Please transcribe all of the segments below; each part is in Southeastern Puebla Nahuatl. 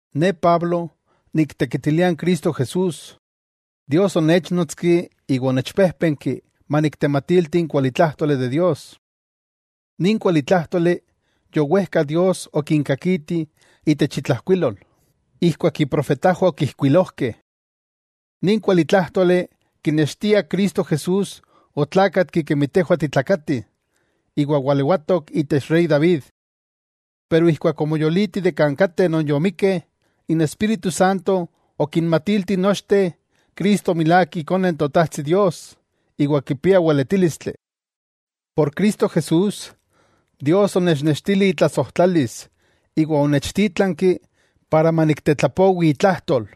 Ne Pablo, niktekitilia n Cristo Jesús. Dios onéchnotski iwa onechpéjpenki maniktematilti n kualitlájtoli de Dios. Nin kualitlájtoli, yowejka Dios okinkakiti itech itlajkuilol, ijkuak iprofetajwah okijkuilojkeh. Nin kualitlájtoli kinextia Cristo Jesús otlákatki kemi tejwah titlakatih, iwa walewatok itech rey David. Pero ijkuak omoyoliti de kan kateh non yomikkeh, n Espíritu Santo okinmatilti nochteh Cristo milák Ikone n Totajtsi Dios iwa kipia weletílistli. Por Cristo Jesús, Dios onechnextili itlasojtlalis iwa onechtítlanki para maniktetlapowi itlajtol,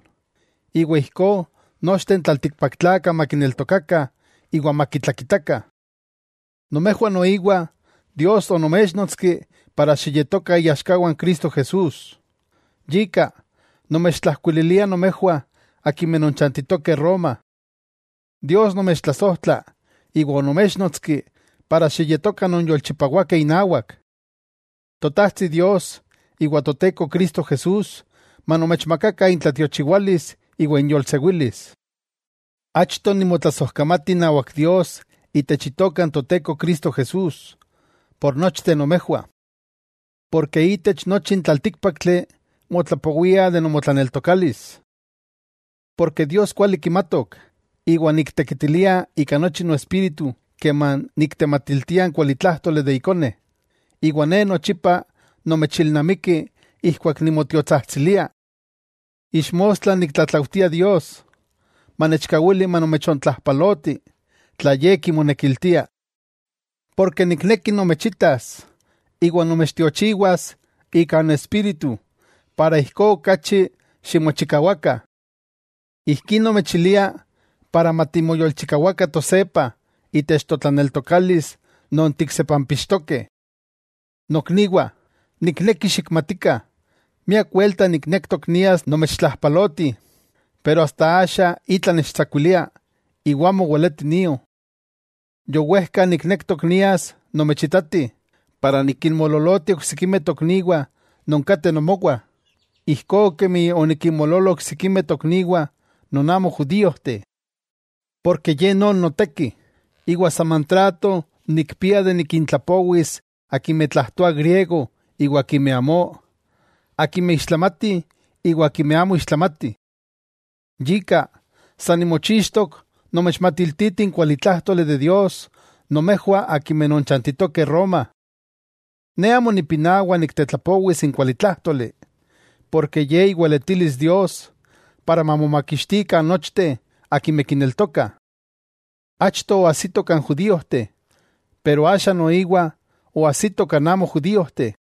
iwa ijkó nochteh n tlaltikpaktlakah makineltokakah iwa makitlakitakah. Nomejwah noiwa Dios onoméchnotski para xiyetokah iaxkawah n Cristo Jesús. Yika, nomechtlajkuililia nomejwah akimeh nonchantitokeh Roma. Dios nomechtlasojtla iwa onoméchnotski para xiyetokah nonyolchipawakeh inawak. Totajtsi Dios iwa Toteko Cristo Jesús manomechmakakah intlatiochiwalis iwa inyolsewilis. Achto nimotlasojkamati inawak Dios itech itoka n Toteko Cristo Jesús, por nochteh nomejwah. Porke itech nochi n tlaltíkpaktli, motlapowia de nomotlaneltokalis. Porke Dios kuali kimatok, iwa niktekitilia ika nochi noespíritu keman niktematiltia n kualitlájtoli de Ikone, iwa ne nochipa nomechilnamiki ijkuak nimotiotsajtsilia. Ixmostla niktlatlaujtia Dios, manechkawili manomechontlajpaloti, tla ye kimonekiltia. Porke nikneki nomechitas iwa nomechtiochiwas ika n Espíritu para ijkó okachi ximochikawakah. Ijkí nomechilia para matimoyolchikawakah tosepah itech totlaneltokalis non tiksepampixtokeh. Nokniwah, nikneki xikmatikah, miak welta niknektok nias nomechtlajpaloti, pero asta axa itla nechtsakuilia iwa amo weleti nio. Yowejka niknektok nias nomechitati para nikinmoololoti oksikimeh tokniwah non kateh nomowah, ijkó kemi onikinmoololo oksikimeh tokniwah non amo judíojteh. Porke ye non noteki, iwa saman trato nikpia de nikintlapowis akimeh tlajtoah griego iwa akimeh amó, akimeh ixtlamatih iwa akimeh amo ixtlamatih. Yika, sa nimochixtok nomechmatiltiti n kualitlájtoli de Dios nomejwah akimeh nonchantitokeh Roma. Ne amo nipinawa niktetlapowis n kualitlájtoli, porke ye iweletilis Dios para mamomakixtikah nochteh akimeh kineltokah. Achto oajsito kan judíojteh, pero axa noiwa oajsito kan amo judíojteh.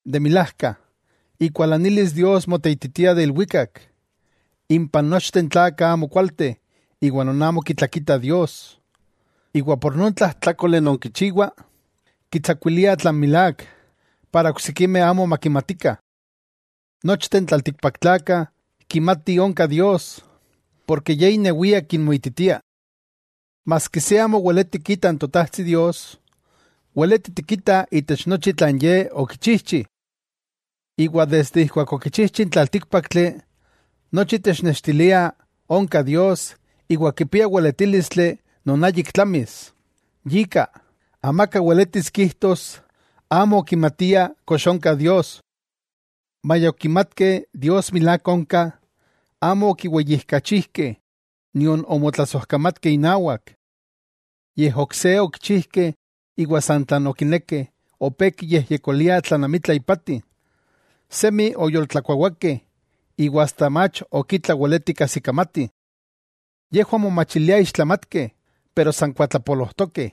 De milajka, ikualanilis Dios moteititia de ilwikak, impan nochteh n tlakah amokualteh iwa non amo kitlakita Dios, iwa por non tlajtlákole non kichiwah, kitsakuilia tlan milák, para oksikimeh amo makimatikah. Nochteh n tlaltikpaktlakah kimatih onka Dios, porke Ye inewia kinmoititia. Maski se amo weleti kita n Totajtsi Dios, weleti tikitah itech nochi tlan ye okichijchi. Iwa desde ijkuak okichijchi n tlaltíkpaktli, nochi technextilia onka Dios iwa kipia weletílistli non ayik tlamis, yika, amaka weletis kijtos amo okimatia kox onka Dios. Maya okimatkeh Dios milák onka, amo okiweyijkachijkeh nion omotlasojkamatkeh inawak. Yej ok se okichijkeh iwa san tlan okinekeh opé kiyejyekoliah tlan amitla ipati. Semi oyoltlakuawakeh iwa asta mach ok itla weletih kajsikamatih. Yejwah momachiliah ixtlamatkeh, pero san kuatlapolojtokeh.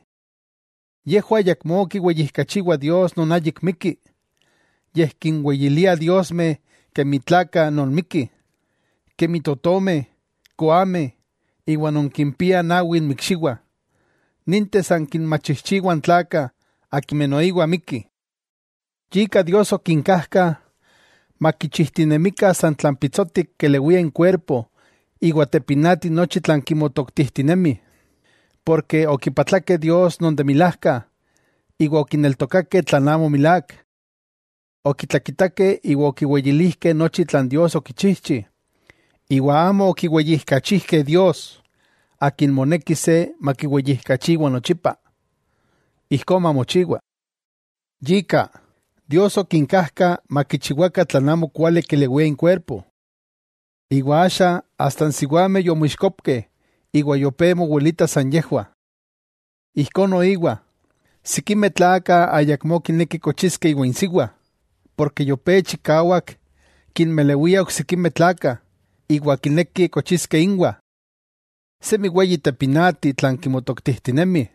Yejwah ayakmó kiweyijkachiwah Dios non ayik mikki, yej kinweyiliah diosmeh kemi tlakah non mikkih, kemi totomeh, koameh iwa non kimpiah nawi inmikxiwah, ninteh san kinmachijchiwah n tlakah akimeh noiwa mikkih. Yika Dios okinkajka makichijtinemikah san tlan pitsotik kelewia inkuerpo iwa tepinati nochi tlan kimotoktijtinemih. Porke okipatlakeh Dios non de milajka, iwa okineltokakeh tlan amo milák. Okitlakitakeh iwa okiweyilijkeh nochi tlan Dios okichijchi, iwa amo okiweyijkachijkeh Dios, Akin moneki se makiweyijkachiwa nochipa. Ijkó mamochiwa. Yika, Dios okinkajka makichiwakah tlan amo kuali kelewia inkuerpo. Iwa axa asta n siwameh yomoixkopkeh iwa yopé mowilitah san yejwah. Ijkó noiwa, sikimeh tlakah ayakmó kineki kochiskeh iwan insiwa, porke yopé chikawak kinmelewiah oksikimeh tlakah iwa kinekih kochiskeh inwah. Semi weyi tepinati tlan kimotoktijtinemih,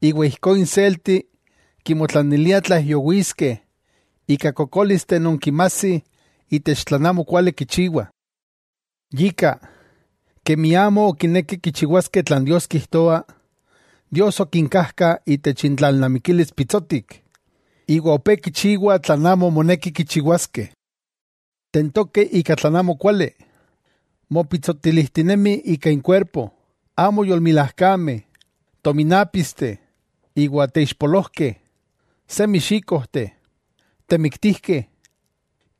iwa ijkó inselti kimotlaniliah tlaijyowiskeh ika kokólisteh non kinmajsih itech tlan amo kuali kichiwah. Yika, kemi amo okinekeh kichiwaskeh tlan Dios kijtoa, Dios okinkajka itech intlalnamikilis pitsotik, iwa opé kichiwah tlan amo moneki kichiwaskeh. Tentokeh ika tlan amokuali. Mopitsotilijtinemih ika inkuerpo, amo yolmilajkameh, tominápisteh iwa teixpolojkeh. Semi xíkojteh, temiktijkeh,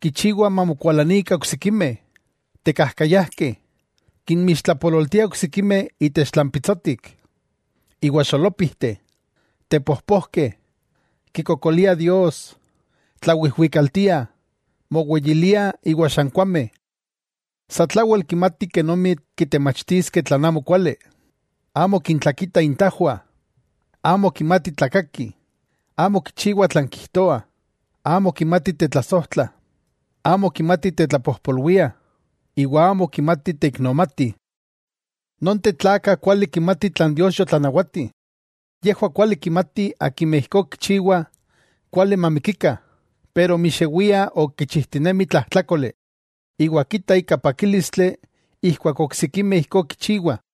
kichiwah mamokualanikah oksikimeh, tekajkayajkeh, kinmixtlapololtiah oksikimeh itech tlan pitsotik, iwa xolópijteh, tepojpojkeh, kikokoliah Dios, tlawijwikaltiah, moweyiliah iwa xankuameh. Satlawel kimatih kenomi kitemachtiskeh tlan amokuali, amo kintlakitah intajwah, amo kimatih tlakakih, amo kichiwah tlan kijtoah, amo kimatih tetlasojtlah, amo kimatih tetlapojpolwiah, iwa amo kimatih teiknomatih. Nonteh tlakah kuali kimatih tlan Dios yotlanawati, yejwah kuali kimatih akimeh ijkó kichiwah kuali mamikikah, pero mixewia ok kichijtinemih tlajtlákoli, iwa kita ika pakílistli ijkuak oksikimeh ijkó kichiwah.